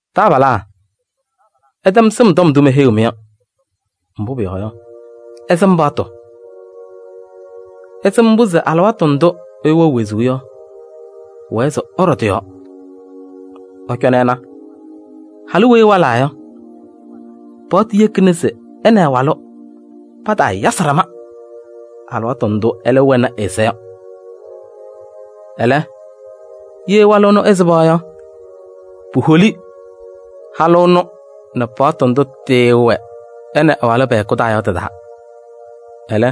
Taabalaa, ɩtɛm sɩm tɔm ndʋ meheyiɣ-mɩ yɔ, mbʋ pʋyɔɔ yɔ, ɩsɩm paɣtʋ: ɩsɩm mbʋ se alɩwaatʋ ndʋ ɛyʋ wɛɣ wezuu yɔ pʋwɛɛ se ɛɖɔ tɩ-yɔɔ. Ɩcɔnɩ ɩna, halʋ weyi ɛwalaa yɔ, paɣtʋ yekina se ɛ nɛ ɛ-walʋ pataayasɩ ɖama alɩwaatʋ ndʋ ɛlɛ wɛnɩ ɛ-ɛza yɔ. Ɛlɛ, ye walʋ ɛnʋ ɛsɩba yɔ, puholi halʋ ɛnʋ nɛ paɣtʋ ndʋ tɩɩwɛ ɛ nɛ ɛ-walʋ pɛ-hɛkʋ taa yɔ tɩ-taa. Ɛlɛ,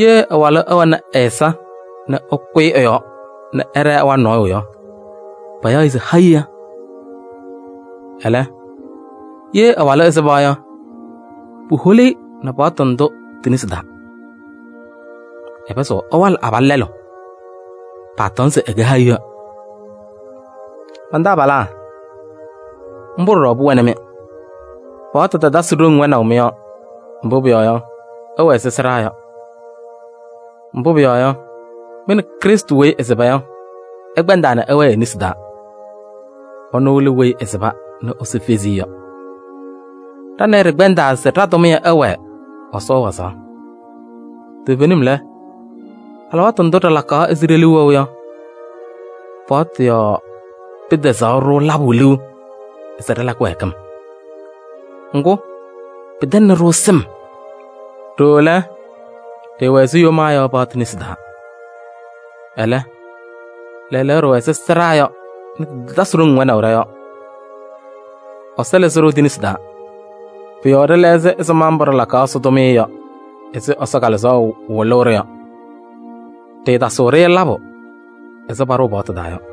ye ɛ-walʋ ɛwɛnɩ ɛ-ɛza nɛ ɛkʋyɩ ɛ-yɔɔ nɛ ɛɖɛɛ ɛwalɩ nɔɔyʋ yɔ, payaɣ-ɩ se hayiɣa. Ɛlɛ, ye ɛ-walʋ ɛsɩba yɔ, puholi-i nɛ paɣtʋ ndʋ ti-nesi taa. Ɛpɩzɩɣ ɛwalɩ abalʋ lɛlʋ, paatɔŋ se ɛkɛ hayiɣa. Man-taabalaa, mbʋ ɖɔɖɔ pʋwɛnɩ-mɩ. Paɣtʋ tatasɩ wɛnaʋ ɖoŋ mɩ-yɔɔ, mbʋ pʋyɔɔ yɔ, ɩwɛ ɛzɩ sɩɖaa yɔ. Mbʋ pʋyɔɔ yɔ, mɩ nɛ Krɩstʋ weyi ɛsɩba yɔ, ɩkpɛndaa nɛ ɩwɛɛ e-nesi taa. Ɛnʋ lɛ weyi ɛsɩba nɛ Ɛsɔ fezi-i yɔ. Ɖa nɛ ɩ ɖɩkpɛndaa se ɖa-tʋmɩyɛ ɛwɛɛ Ɛsɔ wazaɣ. Toovenim lɛ, alɩwaatʋ ndʋ ɖɩlakaɣ ɛzɩ ɖe-liu wɛʋ yɔ, paɣtʋ yɔɔ pɩtɛzaɣ-ɖʋ labʋ liu se ɖɩla kɩwɛɛkɩm. Ŋgʋ, pɩtɛŋnɩ-ɖʋ sɩm. Ɖooo lɛ, ɖɩɩwɛ ɛzɩ yomaa yɔ paɣtʋ nesi taa. Ɛlɛ, lɛɛlɛɛyɔ ɖɩwɛ ɛzɩ sɩɖaa yɔ nɛ tɩtatasɩ ɖoŋ wɛnaʋ ɖɔ-yɔɔ. Ɛsɔ lɩzɩ-ɖʋ ti-nesi taa. Pʋ-yɔɔ ɖɩlɛɣzɩ ɛzɩma mbʋ ɖɩlakaɣ Ɛsɔ tʋmɩyɛ yɔ ɛzɩ Ɛsɔ Kalɩzaɣ wɩlʋʋ-ɖʋ yɔ. Ɖɩɩtasɩɣ-ɖɩ labʋ ɛzɩ paɖʋʋ paɣtʋ taa yɔ.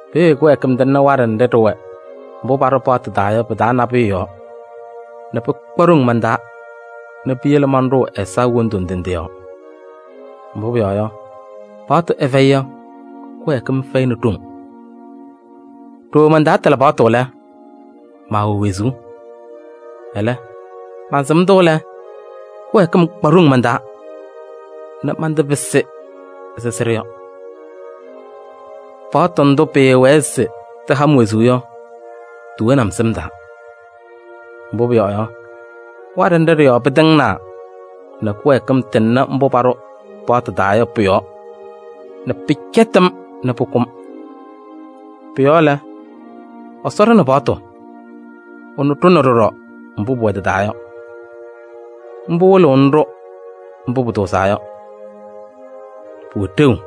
Peeye kɩwɛɛkɩm tɩŋnɩ waɖɛ nɖɩ ɖɩwɛ mbʋ paɖʋ paɣtʋ taa yɔ pɩ-taa nabʋyʋ yɔɔ nɛ pɩkpa ɖoŋ man-taa nɛ piyele manɖʋʋ ɛza wondu ndɩ ndɩ yɔɔ. Mbʋ pʋyɔɔ yɔ, paɣtʋ ɛfɛyɩ yɔ, kɩwɛɛkɩm fɛyɩnɩ ɖoŋ. Ɖooo mantaatɩlɩ paɣtʋ lɛ, maawɛ wezuu. Ɛlɛ, mansɩm-tʋ lɛ, kɩwɛɛkɩm kpa ɖoŋ man-taa nɛ mantɩpɩsɩ ɛzɩ sɩɖʋ yɔ: paɣtʋ ndʋ pɩɩwɛɛ se tɩha-m wezuu yɔ, tiwoni-m sɩm taa. Mbʋ pʋyɔɔ yɔ, waɖɛ nɖɩ ɖɩ-yɔɔ pɩtɩŋnaa nɛ kɩwɛɛkɩm tɩŋnɩ mbʋ paɖʋ paɣtʋ taa yɔ pʋ-yɔɔ nɛ pɩcɛtɩ-m nɛ pʋkʋ-m. Pʋ-yɔɔ lɛ, Ɛsɔ ɖʋnɩ paɣtʋ, ɛnʋ ɖʋnɩ ɖɔɖɔ mbʋ pʋwɛ tɩ-taa yɔ. Mbʋ wɩlɩɣnɩ-ɖʋ mbʋ pʋtʋʋzaa yɔ, pʋwɛ ɖeu.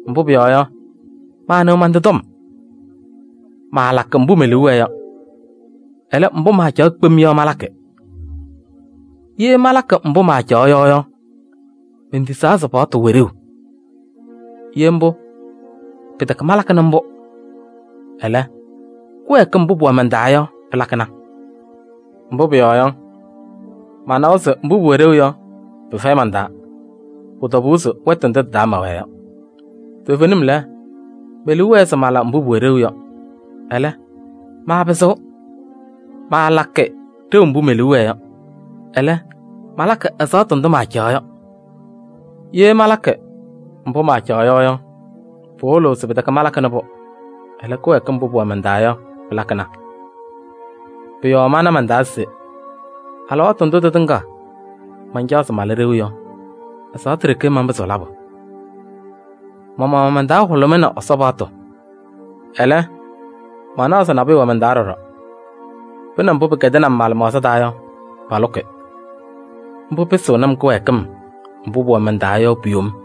Mbʋ pʋyɔɔ yɔ, maanɩɣ man-tɩ tɔm. Maalakɩ mbʋ me-liu wɛɛ yɔ. Ɛlɛ, mbʋ maacaɣ kpem yɔ malakɩ. Ye malakɩ mbʋ maacaɣ yɔ yɔ, mentisaa se paɣtʋ wɛ ɖeu. Ye mbʋ, pɩtɛkɛ malakɩnɩ mbʋ. Ɛlɛ, kɩwɛɛkɩm mbʋ pʋwɛ man-taa yɔ pɩlakɩna. Mbʋ pʋyɔɔ yɔ, manawa se mbʋ pʋwɛ ɖeu yɔ, pɩfɛyɩ man-taa: pʋ-tɔbʋʋ se wɛtʋ ndʋ tɩ-taa mɛwɛɛ yɔ. Toovenim lɛ, me-liu wɛɛ se mala mbʋ pʋwɛ ɖeu yɔ. Ɛlɛ, maapɩzɩɣ. Maalakɩ ɖeu mbʋ me-liu wɛɛ yɔ, ɛlɛ, malakɩ ɛzaɣtʋ ndʋ maacaɣ yɔ. Ye malakɩ mbʋ maacaɣ yɔ yɔ, pɩwɩlɩɣ se pɩtɛkɛ malakɩnɩ-pʋ. Ɛlɛ, kɩwɛɛkɩm mbʋ pʋwɛ man-taa yɔ pɩlakɩna. Pʋ-yɔɔ mana man-taa se: alɩwaatʋ ndʋ tɩtɩŋa mancaɣ se mala ɖeu yɔ, ɛzaɣtʋ ɖeke manpɩzɩɣ labʋ. Ma-maɣmaɣ man-taa hʋlʋmɩnɩ Ɛsɔ paɣtʋ. Ɛlɛ, manaɣ se nabʋyʋ wɛ man-taa ɖɔɖɔ, pʋ nɛ mbʋ pɩkɛdɩnɩ-m ma-lɩmaɣza taa yɔ palʋkɩ. Mbʋ pɩsɩɣnɩ-m kɩwɛɛkɩm mbʋ pʋwɛ man-taa yɔ pu-yom.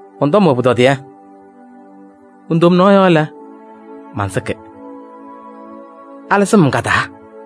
Mɔn-tɔm wɛ pʋtɔdɩyɛ! Mon-tomnaɣ yɔɔ lɛ, mansɩkɩ. Alɩzɩɣ-m ka-taa?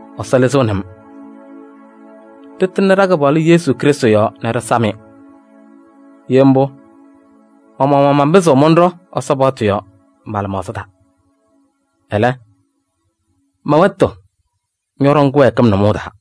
Ɛsɔ lɩzɩɣnɩ-m! Ɖɩtɩŋnɩ ɖa-Kɩpaɣlʋ Yesu Krɩstʋ yɔɔ nɛ ɖɩsam-ɩ! Ye mbʋ, ma-maɣmaɣ manpɩzɩɣ mɔnɖɔ Ɛsɔ paɣtʋ yɔɔ ma-lɩmaɣza taa. Ɛlɛ, mɛ-wɛtʋ ñɔɖɔŋ kɩwɛɛkɩm nʋmɔʋ taa.